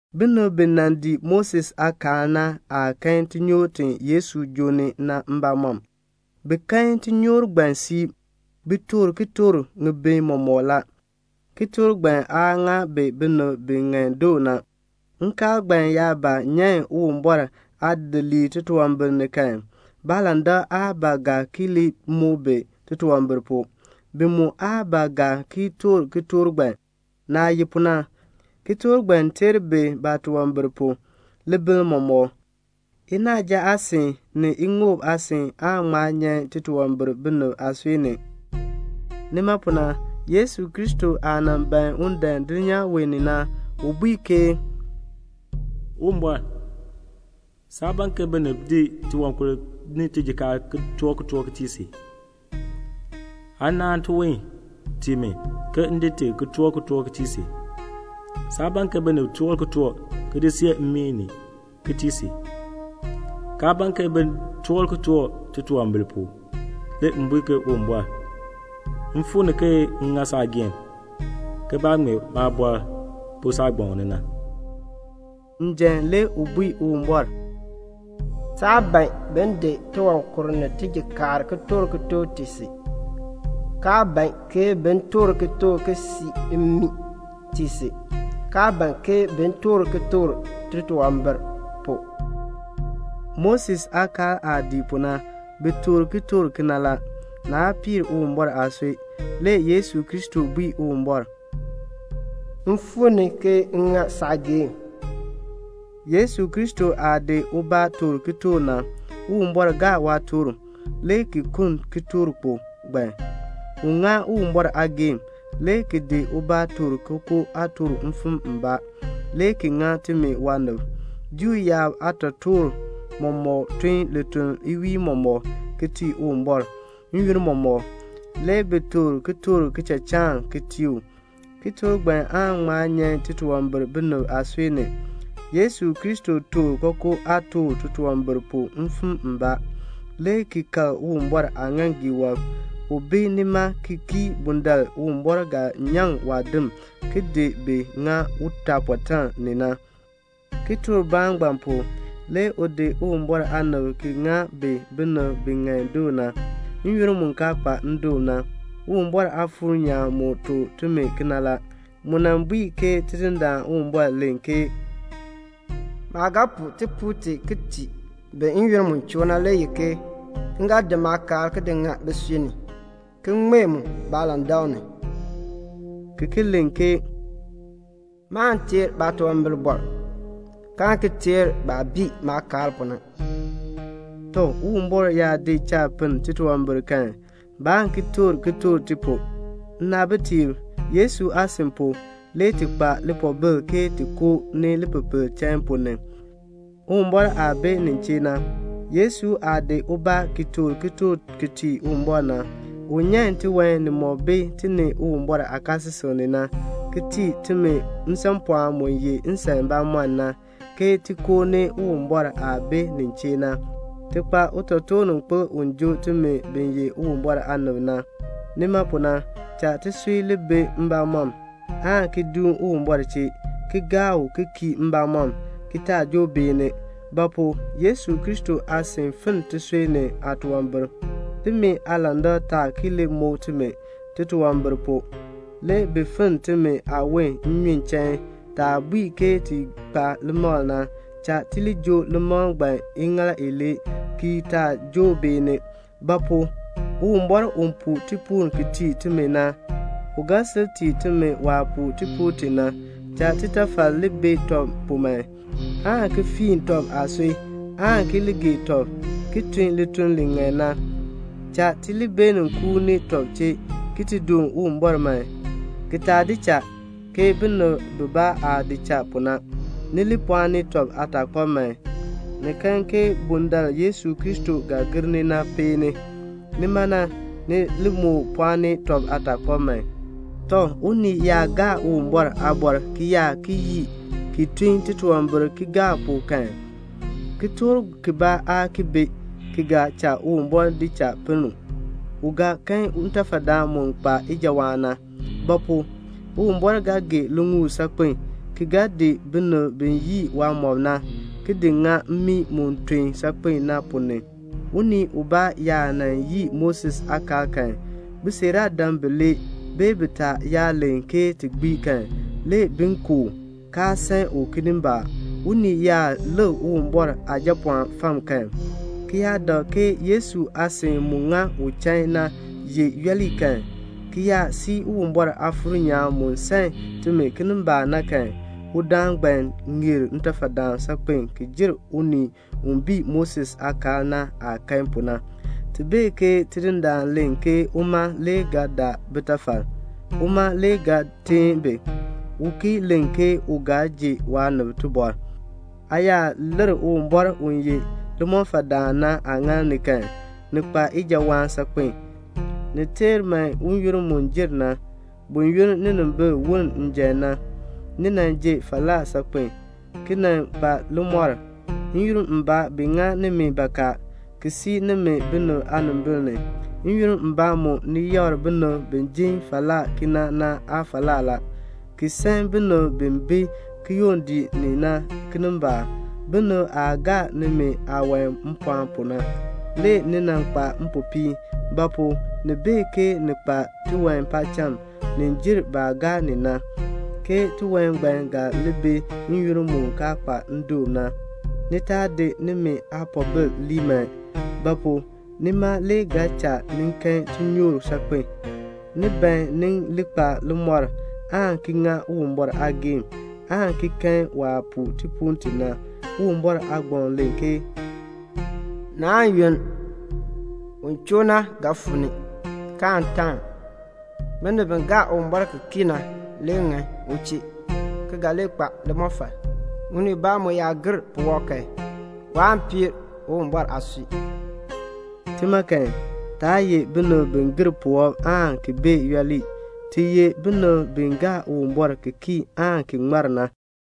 Binib bi nan dii Moses aakaal na aa kan tinyoor ti Yesu joo ni na mbamɔm. Bi kan tinyoor ngbaan siib. Bi toor kitork ŋibin mɔmɔk la. Kitork ngbaan aa ŋa bi binib bi ŋan doo na. Nkaal ngbaan yaa ba nyan Uwumbɔr aadidiliib titunwambir ni kan, baalandak aa ba ga ki li muk bi titunwambir pu. Bi mu aa ba ga ki toor kitork ngbaan. Naah ye pu na, kitork ngbaan teer bi baatunwambir pu, libiln mɔmɔk. Inaaja aasin, ni iŋoob aasin aa ŋma nyan titunwambir binib aasui ni. Nima pu na, Yesu Kristo aah nan ban un dan dulnyaa wee ni na, u bui ke "Uwumbɔr, saa ban ke binib di tiwankur ni tijikaar ki toor kitork ki tii si. Aa naan tiwon tii mi, ke m di ti, ki toor kitork ki tii si. Saa ban ke binib toor kitork, ki di see mmii, ki tii si, kaa ban ke bin toor kitork titunwambir pu. Le m bui ke 'Uwumbɔr, m fuu ni ke m ŋa saageehn, ke baah ŋmee maabɔr pu saagbaŋ ni na."' Njan, le u bui Uwumbɔr, "Saa ban bin di tiwankur ni tijikaar ki toor kitork tii si, kaa ban ke bin toor kitork ki see mmii tii si, kaa ban ke bin toor kitork titunwambir pu." Moses aakaal aah dii pu na, bi toor kitork kena la. Naa piir Uwumbɔr aasui. Le Yesu Kristo bui Uwumbɔr, "M fuu ni ke m ŋa saageehn." Yesu Kristo aah di ubaa toor kitork na, Uwumbɔr gaa waatork, le ki kuln kitorkpok ngbaan. U ŋa Uwumbɔr aageehn, le ki di ubaa toor kookoo aatork mfim mbaa, le ki ŋa timi waanib. Juu yaab aatotoortiib mɔmɔk tun lituln iwiin mɔmɔk, ki tii Uwumbɔr. N-yoonn mɔmɔk, le bi toor kitork kichachaan ki tii u. Kitork ngbaan aan ŋma nyan titunwambir binib aasui ni. Yesu Kristo toor kookoo aatork titunwambir pu mfim mbaa, le ki kal Uwumbɔr aaŋaaŋgii wɔb. U bi nima ki kii bundaln Uwumbɔr ga nyaŋ waadim ki di bi ŋa utaapɔtaan ni na. Kitorkbaan ngbaan pu, le u di Uwumbɔr aanib ki ŋa bi binib bi ŋan doo na, n-yoonn mu kaa kpa ndoon na. Uwumbɔr Aafuur nyaan mu tuk timi kena la. Mu nan bui ke Tidindaan Uwumbɔr len ke "Maah ga puu tipuul ti, ki tii bi n-yoonn mu choo na le ye ke m ga di maakaal ki di ŋa bisui ni, ki ŋmee mu baalandak ni." ki ki len ke "Maan teer baatunwambir, kaan ki teer baah bii maakaal pu na." Tɔ, Uwumbɔr yaa di cha pinn titunwambir kan, baan ki toor kitork ti pu. Nnaabitiib, Yesu aasin pu, le ti kpa lipoobil ke ti koo ni lipepel chain ponn ni, Uwumbɔr aah bi nin chee na. Yesu aah di ubaa ki toor kitork ki tii Uwumbɔr na, u nyan tiwan nimɔk bi ti ni Uwumbɔr aakaasisik ni na, ki tii timi nsanpɔɔn mu ye nsan bamɔnn na, ke ti koo ni Uwumbɔr aah bi nin chee na. Ti kpa utotoorninkpil u joo timi bi ye Uwumbɔr aanib na. Nima pu na, cha tisui li bi mbamɔm, aan ki duun Uwumbɔr chee, ki gaa u ki kii mbamɔm ki taa joo beeni; ba pu? Yesu Kristo aasin finn tisui ni aatunwambir, timi aalandak taa ki li muk timi titunwambir pu. Le bi finn timi aawon nnyun chain. Taah bui ke ti kpa limakl na, cha ti li joo limakl ngbaan iŋaal ilee ki taa joo beeni. Ba pu? Uwumbɔr u puu tipuul ki tii timi na, u ga sil tii timi waah puu tipuul ti na. Cha titafal li bi tɔb pu man, aan ki fiin tɔb aasui, aan ki li gee tɔb, ki tun lituln li ŋan na. Cha ti li beenin kuuni tɔb chee ki ti doon Uwumbɔr man, ki taa di cha, ke binib bibaa aah di cha pu na. Ni li pɔɔni tɔb aataakpab man. Ni kan ke bundaln Yesu Kristo ga gir ni na peeni. Nima na, ni li moo pɔɔni tɔb aataakpab man. Tɔ, unii yaa gaa Uwumbɔr aaliin, ki yaa ki yii, ki tun titunwambir kigaak kan, kitork kibaa aa ki bi, ki ga cha Uwumbɔr di cha pinn u. U ga kan ntafadaan mu kpa ijawaan na; ba pu? Uwumbɔr ga gee liŋuul saakpen, ki ga di binib bi yii waamɔb na, ki di ŋa mmii mu ton saakpen na ponn ni. Unii ubaa yaa nan yii Moses aakaal kan, bisiiraadam bilee, bee bitaa, yaa len kan, le bi ku u, kaa san u kinimbaak. Unii yaa lik Uwumbɔr Aajapɔɔn fam kan, ki yaa dak ke Yesu aasin mu ŋa u chain na ye yooli kan, ki yaa sii Uwumbɔr Aafuur nyaan mu san timi kinimbaak na kan, udaan ngbaan ŋeer ntafadaan saakpen ki jer unii u bii Moses aakaal na aah kan pu na. Ti bee ke Tidindaan len ke uma le ga daa bitafal, uma le ga teen bi. U ki len ke u ga ji waanib tibɔr. Aa yaa lir Uwumbɔr u ye limɔfaldaan na aaŋaal ni kan, ni kpa ijawaan saakpen a. Ni teer man n-yoonn mu jer na. Buyoonn ninimbil woln njan na, ni nan ji falaa saakpen a, ki nan kpa limɔr. N-yoonn mbaa bi ŋa nimi bakaa, ki sii nimi binib aanimbil ni. N-yoonn mbaa mu ni yakr binib bi jin falaa kena na aafalaa la, ki san binib bi bi kiyondiik ni na kinimbaak. Binib aah gaa nimi aawan mpɔɔn pu na, le ni nan kpa mpopiin; ba pu? ni bee ke ni kpa tiwan paacham ni jer baah gaa ni na, ke tiwan ngbaan ga li bi n-yoonn mu kaa kpa ndoon na. Ni taa di nimi aapoobil lii man; ba pu? nima le ga cha ni kan tinyoor saakpen. Ni ban ni li kpa limɔr, aan ki ŋa Uwumbɔr aageehn, aan ki kan waah puu tipuul ti na. Uwumbɔr aagbaŋ len ke "Naan yunn, un choo na ga fuu ni, kaan taan. Binib bi gaa Uwumbɔr ki kii na le ŋan u chee ki ga li kpa limɔfal. Unii ubaa mu yaa gir puwɔb kan, waan piir Uwumbɔr aasui." Tima kan, taa ye binib bi gir puwɔb aan ki bee yooli. Ti ye binib bi gaa Uwumbɔr ki kii aan ki ŋmar na.